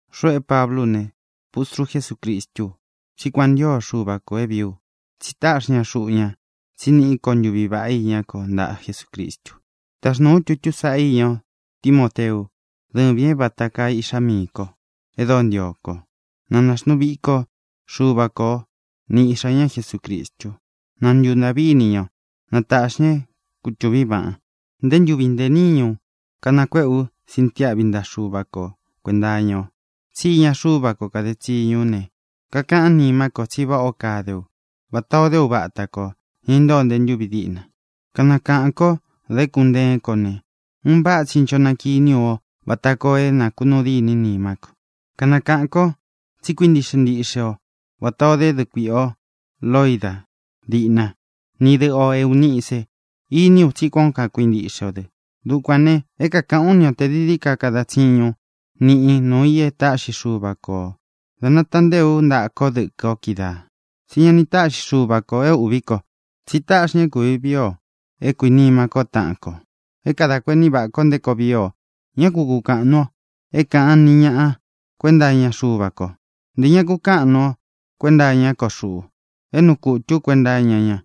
Xuꞌu é Pablú u ne, pustru Jesúcristú u, tsí kuan ō ntío Xuva kō é vīí u, tsi táꞌxi ña xuꞌu ña tsí niꞌi ko ntuví vaꞌá iña ko ntaꞌa Jesucristu. Taxnūu ú tutú sāꞌá iña o, Timóteu, dɨ́vīn é vāta kaa iꞌxá miī ko e dóo ntio kó o. Na naxnuu viko Xuva ko o, ni iꞌxā ñá Jesucristu. Na ntūntaꞌví ini ña o. Na tāꞌxi ña é kutūvín vaꞌan. Ntē ntúvi ntē níñu kanakuéꞌē ú sintiáꞌvi ntaꞌa Xuva ko kuēnta iña o. Tsí iña Xuva ko káde tsiñu ú ne, kakaꞌán nimá ko tsi váꞌā ó kade ú, vatā o dé uva ata kō, ña intóo nte ntúvi diꞌna. Kanakaꞌān kó da ékun nteén ko ne, un váꞌa tsi ncho nakiní u o vata koo é nakunuu dîní nimá ko. Kanakaꞌān kó tsi kakuintiꞌxe ntíꞌxe o vatā o dé dɨꞌɨ kuiꞌi o Loida díꞌna, ni dɨꞌɨ o Eūnice. Iní u tsí kuān ó kakuintiꞌxe o dɨ. Dukuān ne, é kākaꞌán u ni o tē dií dií ka kadan tsiñun niꞌin nuū í e táꞌxi Xuva ko ō da nataꞌán ntée ú ntaꞌa kó dɨkɨ o kídaā. Tsí ña ni táꞌxi Xuva kō é ūꞌvi ko, tsí táꞌxi ña é kūvi vii o, é kuīnima kó taꞌan kō, é kadā kuení vaꞌā ko nté koo vii o. Ñá ku kukāꞌan nuu o é kāꞌan ni ñaꞌa kuenta iña Xuva ko. Ntē ña kukáꞌan nuu o kuenta iñá ko xuꞌu, é nuu kutū ú kuenta iña ña.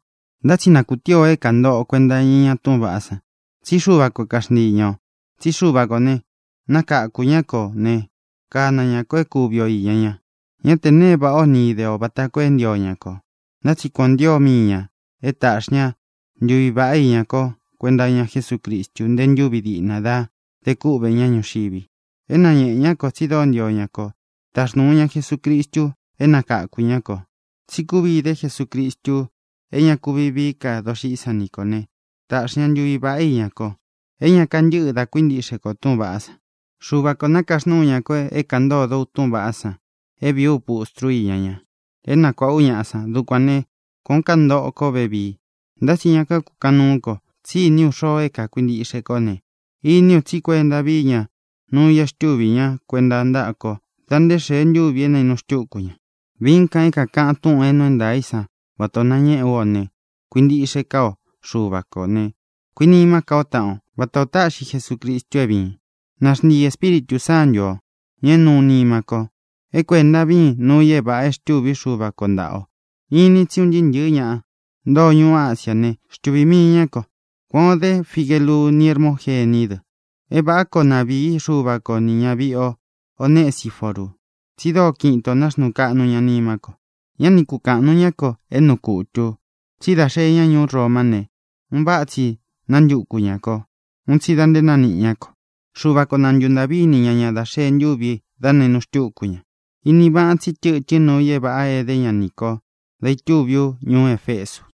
Ntá tsi na kūtíi o é kāntoꞌo o kuenta iña túꞌūn vaꞌá san, tsí Xuva ko kaxntiī ña o. Tsí Xuva kō ne, nakáku ña kō ne, kana ña kō é kuvi o īña ña. Ñá tē nee é vāꞌá o ni ide o vata koo é ntio ña kō. Ntá tsi kuan ō ntío mii ñā é taꞌxi ña ntuvi vāꞌá iña ko kuenta iña Jesúcristu nté ntūvi diꞌna da de kúꞌvē ñá ñuxivi. É nañēꞌe ñá kō tsi dóo ntio ña kō da táxnūu ña Jesucristu é nakakū ñá kō. Tsi kúvi ide Jesucristu é ña kuvi vií ka doxiꞌí san ni kō ne, taꞌxi ña ntuvi vāꞌá iña ko é ña kantɨ́ꞌɨ dá kuintiꞌxe kō túꞌūn vaꞌá san. Xuva kō nakaxnúu ña ko é kāꞌan ntódō u túꞌūn vaꞌá san, é vīí u pustru íña ña, é nakuāꞌa ú ñaꞌa san. Dukuān né, kuān ó kantoꞌō kó vevii. Ntá tsi ña kakukaꞌan núu ko, tsí iní u xoo é kakuintiꞌxe kó ne, iní u tsí kuenta víi ña nuu i é xtúvī ña kuenta ntaꞌa kó da nté xee ntúvi é nainu xtúku ña. Viín kan é kākaꞌan túꞌūn é nuu é ntaā í san vatā ó nañéꞌē ú o ne, kuintiꞌxe ká o Xuva kō ne, kuinimá ka o taꞌan o, vatā o táꞌxi Jesucristu é vīin. Na xntii Ēspíritū Sántu ō, ña é nuu nima ko, é kuēnta víin nuu i é vāꞌa é xtûví Xuva ko ntāꞌa o. Inin tsí un ntɨɨ́ ntɨ̄ɨ́ ña ntoo ñuú Asiá ne, xtuvī mii ñá ko. Kuān o dé Figelu ni Hermógení dɨ. É vāꞌá koo na vīí Xuva ko nī ñaviꞌi Onesiforu, tsi dóo kiꞌin itō náxnuu kaꞌnu ña nimá ko. Ñá ni kukāꞌan nuu ñá ko é nuu kutū u. Tsí dā xee ña ñuú Romá ne, un váꞌa tsi nántuku ñā kó, un tsi da nte nániꞌi ñá ko. Xuva ko na ntūntaꞌví ini ña ña dá xēe ntúvi dá nainu xtúku ña. Inin vaꞌan tsí tɨtɨ́n nuu i é vāꞌa êdé ña nī kó dá itúvi ú ñuú Efesu.